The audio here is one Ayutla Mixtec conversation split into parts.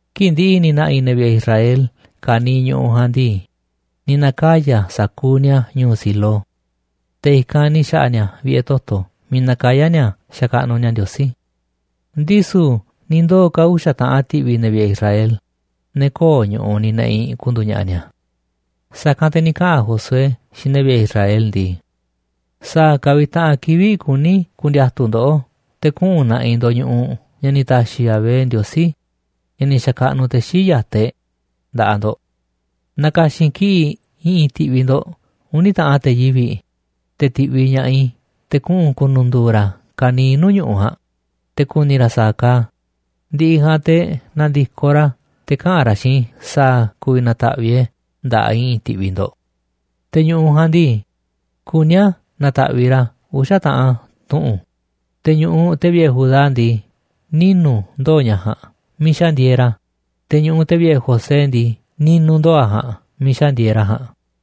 Kii̱ꞌ ndi̱ꞌi̱ ni̱ na̱ꞌi̱ ne̱ vi̱ꞌe̱ Israel ka̱niiꞌ ñu̱ꞌuꞌ ja̱a̱nꞌ ndii, ni̱ na̱kaya̱ sa̱kuuꞌ ni̱a̱ ñu̱u̱ Silo. Te̱ i̱kanꞌ ni̱ xa̱ꞌa̱ ni̱a̱ vi̱ꞌe̱ toto̱ miiꞌ nakayá ni̱a̱ xakaꞌnuꞌ ni̱a̱ Ndiosí. Ndisu̱ ni̱ ndoo̱ ka̱ uxa̱ taꞌan ti̱ꞌvi̱ ne̱ vi̱ꞌe̱ Israel, ne̱ köo̱ꞌ ñu̱ꞌuꞌ ni̱ ne̱ꞌi̱ ku̱ndu̱u̱ ña̱ꞌa̱ ni̱a̱. Sa̱kanꞌ te̱ ni̱ kaꞌa̱n Josué xiinꞌ ne̱ vi̱ꞌe̱ Israel ndii: ―¿Sa̱a̱ ka̱ vi̱ꞌ taꞌan kivi̱ꞌ kuni ku̱ndi̱a̱tu̱ ndoꞌó te̱ kuꞌu̱n na̱ꞌi̱ ndo̱ꞌ ñu̱ꞌuꞌ ña̱ ni̱ ta̱xi̱ Yahvé, Ndiosí ña̱ ni̱ xa̱kaꞌnuꞌ te̱ xii̱ꞌ ya̱taꞌ e̱ꞌ, nda̱ꞌaꞌ ndo̱ꞌ? Na̱ka̱xi̱n kiꞌi̱ꞌ i̱ꞌi̱n ti̱ꞌvi̱ ndo̱ꞌ uni̱ taꞌan te̱ yivi̱ꞌ, te̱ ti̱ꞌviꞌ ña̱ꞌaꞌ i̱ te̱ kuꞌu̱n ku̱nu̱ndu̱u̱ ra̱ ka̱niiꞌ nuu̱ꞌ ñu̱ꞌuꞌ ja̱a̱nꞌ, te̱ ku̱ni̱ ra̱ sa̱a̱ kaaꞌ a̱, ndi̱ꞌi̱ ja̱a̱nꞌ te̱ na̱ndi̱koꞌ ra̱ te̱ kaꞌa̱n ra̱ xiinꞌ i̱ sa̱a̱ ku̱vi̱ na̱ta̱ꞌviꞌ e̱ꞌ e̱ nda̱ꞌaꞌ i̱ꞌi̱n ti̱ꞌvi̱ ndo̱ꞌ. Te̱ ñu̱ꞌuꞌ ja̱a̱nꞌ ndii, kuní a̱ na̱ta̱ꞌviꞌ ra̱ a̱ uxa̱ taꞌan tuꞌu̱nꞌ, te̱ ñu̱ꞌuꞌ te̱ vi̱ꞌe̱ Judá ndii, ninu̱ ndoo̱ ña̱ ja̱a̱nꞌ miiꞌ xa̱ ndieeꞌ ra̱, te̱ ñu̱ꞌuꞌ te̱ vi̱ꞌe̱ José ndii, ni̱nu̱ ndoo̱ a̱ ja̱a̱nꞌ miiꞌ xa̱ ndieeꞌ ra̱ ja̱a̱nꞌ.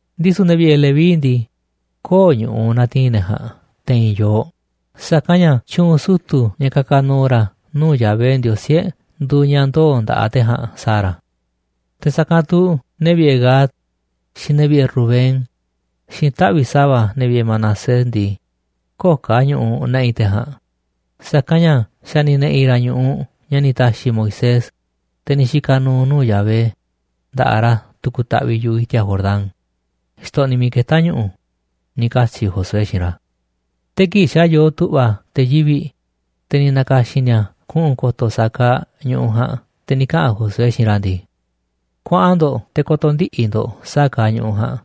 Ndisu̱ ne̱ vi̱ꞌe̱ Leví ndii, köo̱ꞌ ñu̱ꞌuꞌ na̱ti̱i̱n ne̱ ja̱a̱nꞌ te̱i̱n yooꞌ, sa̱kanꞌ ña̱ tyu̱u̱n sutu̱ ña̱ ka̱ka̱ nu̱u̱ ra̱ nuu̱ꞌ Yahvé, Ndiosí e̱ꞌ, nduuꞌ ña̱ ndoo̱ nda̱ꞌaꞌ te̱ ja̱a̱nꞌ sa̱a̱ ra̱. Te̱ sa̱kanꞌ tu̱ ne̱ vi̱ꞌe̱ Gad, xiinꞌ ne̱ vi̱ꞌe̱ Rubén, xiinꞌ taꞌvi̱ꞌ sa̱va̱ ne̱ vi̱ꞌe̱ Manasés ndii, köo̱ꞌ ka̱ ñu̱ꞌuꞌ ne̱ꞌi̱ te̱ ja̱a̱nꞌ, sa̱kanꞌ ña̱ xa̱ ni̱ ne̱ꞌi̱ ra̱ ñu̱ꞌuꞌ ña̱ ni̱ ta̱xi̱ Moisés, te̱ ni̱ xika̱ nu̱u̱ nuu̱ꞌ Yahvé, nda̱ꞌaꞌ ra̱ tu̱ku̱ taꞌviꞌ yu̱ꞌuꞌ i̱ti̱a̱ Jordán, xtoꞌniꞌ miiꞌ ketá ñu̱ꞌu̱ ―ni̱ katyi̱ Josué xiinꞌ ra̱. Te̱ kii̱ꞌ xa̱ yoo tu̱ꞌva̱ te̱ yivi̱ꞌ, te̱ ni̱ na̱ka̱xi̱n ni̱a̱ kuꞌu̱n ko̱to̱ sa̱a̱ kaaꞌ ñu̱ꞌuꞌ ja̱a̱nꞌ, te̱ ni̱ kaꞌa̱n Josué xiinꞌ ra̱ ndii: ―Kuaꞌan ndo̱ꞌ te̱ ko̱to̱ ndiꞌi̱ ndo̱ꞌ sa̱a̱ kaaꞌ ñu̱ꞌuꞌ ja̱a̱nꞌ,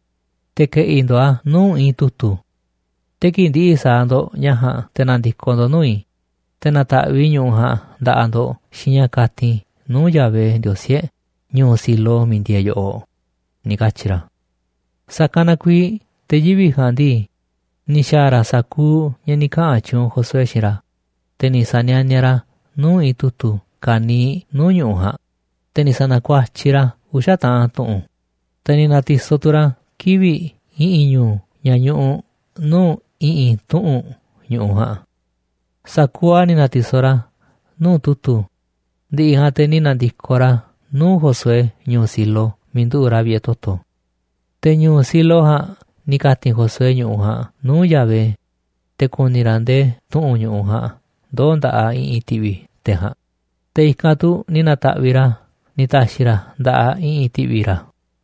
te̱ ke̱ꞌi̱ ndo̱ꞌ a̱ nuu̱ꞌ i̱i̱n tu̱tu̱. Te̱ kii̱ꞌ ndi̱ꞌi̱ sa̱a̱ ndo̱ꞌ ña̱ ja̱a̱nꞌ, te̱ na̱ndi̱koꞌ ndo̱ꞌ nuu̱ꞌ i̱, te̱ na̱ta̱ꞌviꞌ i̱ ñu̱ꞌuꞌ ja̱a̱nꞌ nda̱ꞌaꞌ ndo̱ꞌ xiinꞌ ña̱ ka̱ti̱n i̱ nuu̱ꞌ Yahvé, Ndiosí e̱ꞌ, ñu̱u̱ Silo miiꞌ ndieeꞌ yoꞌoꞌ ―ni̱ katyi̱ ra̱. Sa̱kanꞌ na kuiiꞌ te̱ yivi̱ꞌ ja̱a̱nꞌ ndii, ni̱ xa̱a̱ ra̱ sa̱kuuꞌ ña̱ ni̱ kaꞌa̱n tyuunꞌ Josué xiinꞌ ra̱, te̱ ni̱ sa̱nianiaꞌ ra̱ nuu̱ꞌ i̱i̱n tu̱tu̱ ka̱niiꞌ nuu̱ꞌ ñu̱ꞌuꞌ ja̱a̱nꞌ, te̱ ni̱ sa̱na̱kuatyiꞌ ra̱ a̱ uxa̱ taꞌan tuꞌu̱nꞌ, te̱ ni̱ na̱ti̱soꞌ tu̱ ra̱ kivi̱ꞌ i̱ꞌi̱n ñu̱u̱ ña̱ ñuꞌuꞌ nuu̱ꞌ i̱ꞌi̱n tuꞌu̱nꞌ ñu̱ꞌuꞌ ja̱a̱nꞌ. Sa̱kuuꞌ a̱ ni̱ na̱ti̱soꞌ ra̱ nuu̱ꞌ tu̱tu̱, ndi̱ꞌi̱ ja̱a̱nꞌ te̱ ni̱ na̱ndi̱koꞌ ra̱ nuu̱ꞌ Josué ñu̱u̱ Silo miiꞌ nduꞌu̱ꞌ ra̱ vi̱ꞌe̱ toto̱. Te̱ ñu̱u̱ Silo ja̱a̱nꞌ ni̱ ka̱ti̱n Josué ñu̱ꞌuꞌ ja̱a̱nꞌ nuu̱ꞌ Yahvé, te̱ ku̱ni̱ ra̱ ndee tuꞌu̱nꞌ ñu̱ꞌuꞌ ja̱a̱nꞌ ndoo̱ nda̱ꞌaꞌ i̱ꞌi̱n ti̱ꞌvi̱ te̱ ja̱a̱nꞌ, te̱ i̱kanꞌ tu̱ ni̱ na̱ta̱ꞌviꞌ ra̱ a̱ ni̱ ta̱xi̱ ra̱ nda̱ꞌaꞌ i̱ꞌi̱n ti̱ꞌvi̱ ra̱.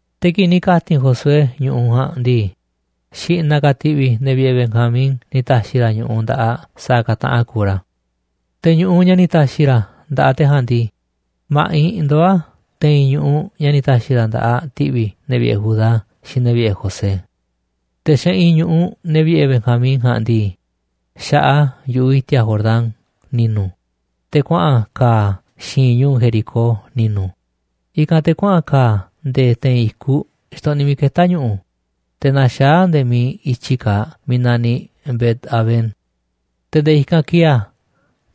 Te̱ kii̱ꞌ ni̱ ka̱ti̱n Josué ñu̱ꞌuꞌ ja̱a̱nꞌ ndii, xi̱ꞌna̱ ka̱ ti̱ꞌvi̱ ne̱ vi̱ꞌe̱ Banjamín ni̱ ta̱xi̱ ra̱ ñu̱ꞌuꞌ nda̱ꞌaꞌ sa̱a̱ ka̱ taꞌan kuuꞌ ra̱. Te̱ ñu̱ꞌuꞌ ña̱ ni̱ ta̱xi̱ ra̱ nda̱ꞌaꞌ te̱ ja̱a̱nꞌ ndii, ma̱ꞌiꞌ ndoó a̱ te̱i̱n ñu̱ꞌuꞌ ña̱ ni̱ ta̱xi̱ ra̱ nda̱ꞌaꞌ ti̱ꞌvi̱ ne̱ vi̱ꞌe̱ Judá xiinꞌ ne̱ vi̱ꞌe̱ José. Te̱ xeꞌinꞌ ñu̱ꞌuꞌ ne̱ vi̱ꞌe̱ Benjamín ja̱a̱nꞌ ndii, xaꞌaꞌ a̱ yu̱ꞌuꞌ i̱ti̱a̱ Jordán ni̱nu̱, te̱ kuaꞌa̱n ka̱a̱ a̱ xi̱i̱nꞌ ñu̱u̱ Jericó ni̱nu̱, i̱kanꞌ te̱ kuaꞌa̱n ka̱a̱ a̱ nde̱e̱ te̱i̱n i̱kuꞌ xtoꞌniꞌ miiꞌ ketá ñu̱ꞌu̱, te̱ naxaá a̱ nde̱e̱ miiꞌ i̱tyi kaaꞌ miiꞌ naniꞌ Bet-avén. Te̱ nde̱e̱ i̱kanꞌ kieeꞌ a̱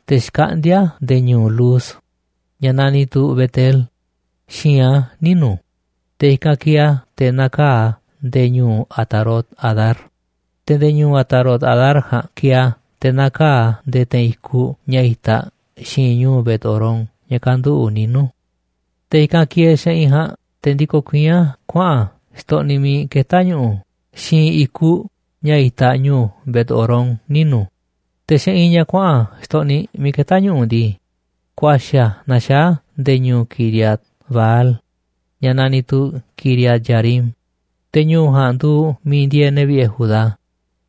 te̱ xkaꞌndíá a̱ nde̱e̱ ñu̱u̱ Luz, ña̱ naniꞌ tu̱ Bet-el, xi̱i̱nꞌ a̱ ninu̱, te̱ i̱kanꞌ kieeꞌ a̱ te̱ nakaa̱ꞌ a̱ nde̱e̱ ñu̱u̱ Atarot-adar, te̱ nde̱e̱ ñu̱u̱ Atarot-adar ja̱a̱nꞌ kieeꞌ a̱ te̱ nakaa̱ꞌ a̱ nde̱e̱ te̱i̱n i̱kuꞌ ña̱ itaꞌ xi̱i̱nꞌ ñu̱u̱ Bet-horón ña̱ kanduꞌu̱ꞌ ninu̱. Te̱ i̱kanꞌ kieeꞌ xeꞌinꞌ ja̱a̱nꞌ te̱ ndikoꞌ kuiín a̱ kuaꞌa̱n a̱ xtoꞌniꞌ miiꞌ ketá ñu̱ꞌu̱ xi̱i̱nꞌ i̱kuꞌ ña̱ itaꞌ ñu̱u̱ Bet-horón ninu̱, te̱ xeꞌinꞌ ña̱ kuaꞌa̱n xtoꞌniꞌ miiꞌ ketá ñu̱ꞌu̱ ndii, ku̱a̱xi̱ a̱ naxaá a̱ nde̱e̱ ñu̱u̱ Quiriat-baal, ña̱ naniꞌ tu̱ Quiriat-jearim, te̱ ñu̱u̱ ja̱a̱nꞌ nduuꞌ miiꞌ ndieeꞌ ne̱ vi̱ꞌe̱ Judá,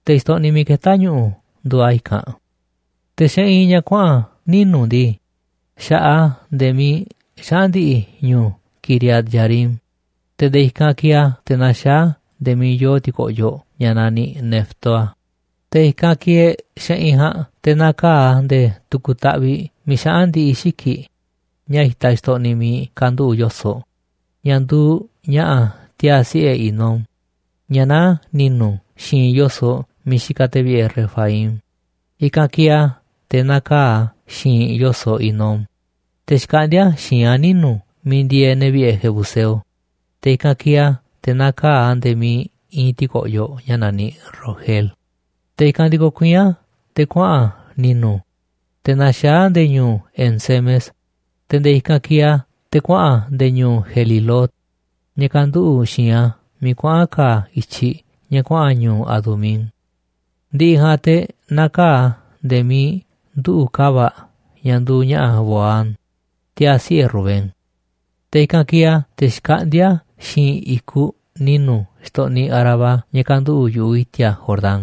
te̱ xtoꞌniꞌ miiꞌ ketá ñu̱ꞌu̱ nduuꞌ a̱ i̱kanꞌ. Te̱ xeꞌinꞌ ña̱ kuaꞌa̱n ninu̱ ndii, xaꞌaꞌ a̱ nde̱e̱ miiꞌ xaꞌa̱n ndi̱ꞌi̱ ñu̱u̱ Quiriat-jearim, te̱ nde̱e̱ i̱kanꞌ kieeꞌ a̱ te̱ naxaá a̱ nde̱e̱ miiꞌ yoo ti̱ko̱ꞌyoꞌ ña̱ naniꞌ Neftoa, te̱ i̱kanꞌ kieeꞌ xeꞌinꞌ ja̱a̱nꞌ te̱ nakaa̱ꞌ a̱ nde̱e̱ tu̱ku̱ taꞌviꞌ miiꞌ xaꞌa̱n ndi̱ꞌi̱ xiki̱ꞌ ña̱ itaꞌ xtoꞌniꞌ miiꞌ kanduꞌu̱ꞌ yo̱soꞌ, ña̱ nduuꞌ ña̱ꞌa̱ tiaa̱ siꞌe̱ Hinom ña̱ naá ni̱nu̱ xi̱i̱nꞌ yo̱soꞌ miiꞌ xikaꞌ te̱ vi̱ꞌe̱ Refaim. I̱kanꞌ kieeꞌ a̱ te̱ nakaa̱ꞌ a̱ xi̱i̱nꞌ yo̱soꞌ Hinom, te̱ xkaꞌndíá a̱ xi̱i̱nꞌ a̱ ninu̱ miiꞌ ndieeꞌ ne̱ vi̱ꞌe̱ jebuseo, te̱ i̱kanꞌ kieeꞌ a̱ te̱ nakaa̱ꞌ a̱ nde̱e̱ miiꞌ iinꞌ ti̱ko̱ꞌyoꞌ ña̱ naniꞌ Rogel. Te̱ i̱kanꞌ ndikoꞌ kuiín a̱ te̱ kuaꞌa̱n a̱ ni̱nu̱, te̱ naxaá a̱ nde̱e̱ ñu̱u̱ En-semes, te̱ nde̱e̱ i̱kanꞌ kieeꞌ a̱ te̱ kuaꞌa̱n a̱ nde̱e̱ ñu̱u̱ Gelilot, ña̱ kanduꞌu̱ꞌ xi̱i̱nꞌ a̱ miiꞌ kuaꞌa̱n ka̱a̱ i̱tyiꞌ ña̱ kuaꞌa̱n ñu̱u̱ Adumín. Ndi̱ꞌi̱ ja̱a̱nꞌ te̱ nakaa̱ꞌ a̱ nde̱e̱ miiꞌ nduꞌu̱ꞌ ka̱va̱ꞌ ña̱ nduuꞌ ña̱ꞌa̱ Bohán, tiaa̱ siꞌe̱ Rubén. Te̱ i̱kanꞌ kieeꞌ a̱ te̱ xkaꞌndíá a̱ xi̱i̱nꞌ i̱kuꞌ ni̱nu̱ xtoꞌniꞌ Arabá ña̱ kanduꞌu̱ꞌ yu̱ꞌuꞌ i̱ti̱a̱ Jordán,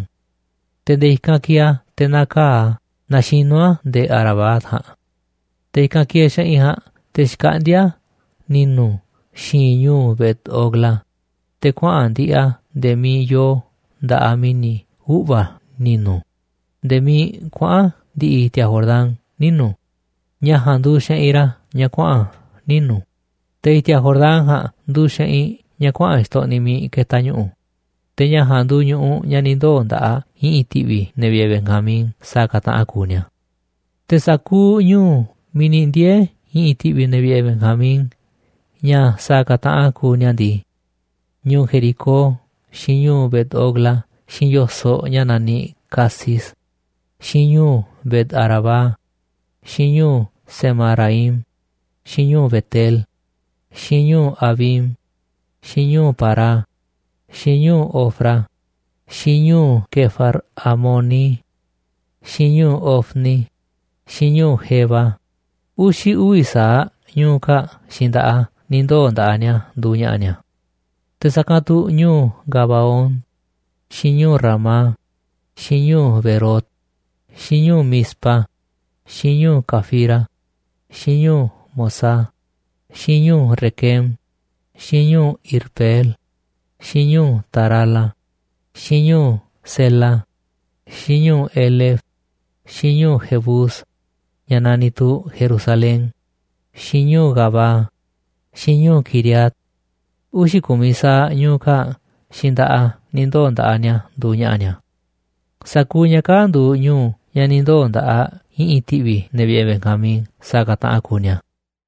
te̱ nde̱e̱ i̱kanꞌ kieeꞌ a̱ te̱ nakaa̱ꞌ a̱ naxinú a̱ nde̱e̱ Arabá ja̱a̱nꞌ. Te̱ i̱kanꞌ kieeꞌ xeꞌinꞌ ja̱a̱nꞌ te̱ xkaꞌndíá a̱ ni̱nu̱ xi̱i̱nꞌ ñu̱u̱ Bet-hogla, te̱ kuaꞌa̱n ndi̱ꞌi̱ a̱ nde̱e̱ miiꞌ yoo nda̱ꞌaꞌ mi̱ni̱ uꞌva̱ ni̱nu̱, nde̱e̱ miiꞌ kuaꞌa̱n ndi̱ꞌi̱ i̱ti̱a̱ Jordán ninu̱, ña̱ ja̱a̱nꞌ nduuꞌ xeꞌinꞌ ra̱ ña̱ kuaꞌa̱n ninu̱. Te̱ i̱ti̱a̱ Jordán ja̱a̱nꞌ nduuꞌ xeꞌinꞌ ña̱ kuaꞌa̱n xtoꞌniꞌ miiꞌ ketaꞌ ñu̱ꞌu̱. Te̱ ña̱ ja̱a̱nꞌ nduuꞌ ñu̱ꞌuꞌ ña̱ ni̱ ndoo̱ nda̱ꞌaꞌ i̱ꞌi̱n ti̱ꞌvi̱ ne̱ vi̱ꞌe̱ Benjamín sa̱a̱ ka̱ taꞌan kuuꞌ ni̱a̱. Te̱ sa̱kuuꞌ ñu̱u̱ miiꞌ ni̱ ndiee̱ i̱ꞌi̱n ti̱ꞌvi̱ ne̱ vi̱ꞌe̱ Benjamín ña̱ sa̱a̱ ka̱ taꞌan kuuꞌ ni̱a̱ ndii: ñu̱u̱ Jericó, xiinꞌ ñu̱u̱ Bet-hogla, xiinꞌ yo̱soꞌ ña̱ naniꞌ Casis, xiinꞌ ñu̱u̱ Bet-arabá, xiinꞌ ñu̱u̱ Zemaraim, xiinꞌ ñu̱u̱ Bet-el, xiinꞌ ñu̱u̱ Avim, xiinꞌ ñu̱u̱ Pará, xiinꞌ ñu̱u̱ Ofra, xiinꞌ ñu̱u̱ Quefar-haamoni, xiinꞌ ñu̱u̱ Ofni, xiinꞌ ñu̱u̱ Geba. Uxi̱ uvi̱ sa̱aꞌ ñu̱u̱ kaa̱ꞌ xiinꞌ nda̱ꞌaꞌ a̱ ni̱ ndoo̱ nda̱ꞌaꞌ ni̱a̱ nduuꞌ ña̱ꞌa̱ ni̱a̱. Te̱ sa̱kanꞌ tu̱ ñu̱u̱ Gabaón, xiinꞌ ñu̱u̱ Ramá, xiinꞌ ñu̱u̱ Beerot, xiinꞌ ñu̱u̱ Mizpa, xiinꞌ ñu̱u̱ Cafira, xiinꞌ ñu̱u̱ Mozah, xiinꞌ ñu̱u̱ Requem, xiinꞌ ñu̱u̱ Irpeel, xiinꞌ ñu̱u̱ Tarala, xiinꞌ ñu̱u̱ Zela, xiinꞌ ñu̱u̱ Elef, xiinꞌ ñu̱u̱ Jebús, ña̱ naniꞌ tu̱ Jerusalén, xiinꞌ ñu̱u̱ Gabaa, xiinꞌ ñu̱u̱ Quiriat, uxi̱ ku̱miꞌ sa̱aꞌ ñu̱u̱ kaa̱ꞌ xiinꞌ nda̱ꞌaꞌ a̱ ni̱ ndoo̱ nda̱ꞌaꞌ ni̱a̱ nduuꞌ ña̱ꞌa̱ ni̱a̱. Sa̱kuuꞌ ña̱ kaa̱ꞌ nduuꞌ ñu̱u̱ ña̱ ni̱ ndoo̱ nda̱ꞌaꞌ i̱ꞌi̱n ti̱ꞌvi̱ ne̱ vi̱ꞌe̱ Benjamín sa̱a̱ ka̱ taꞌan kuuꞌ ni̱a̱.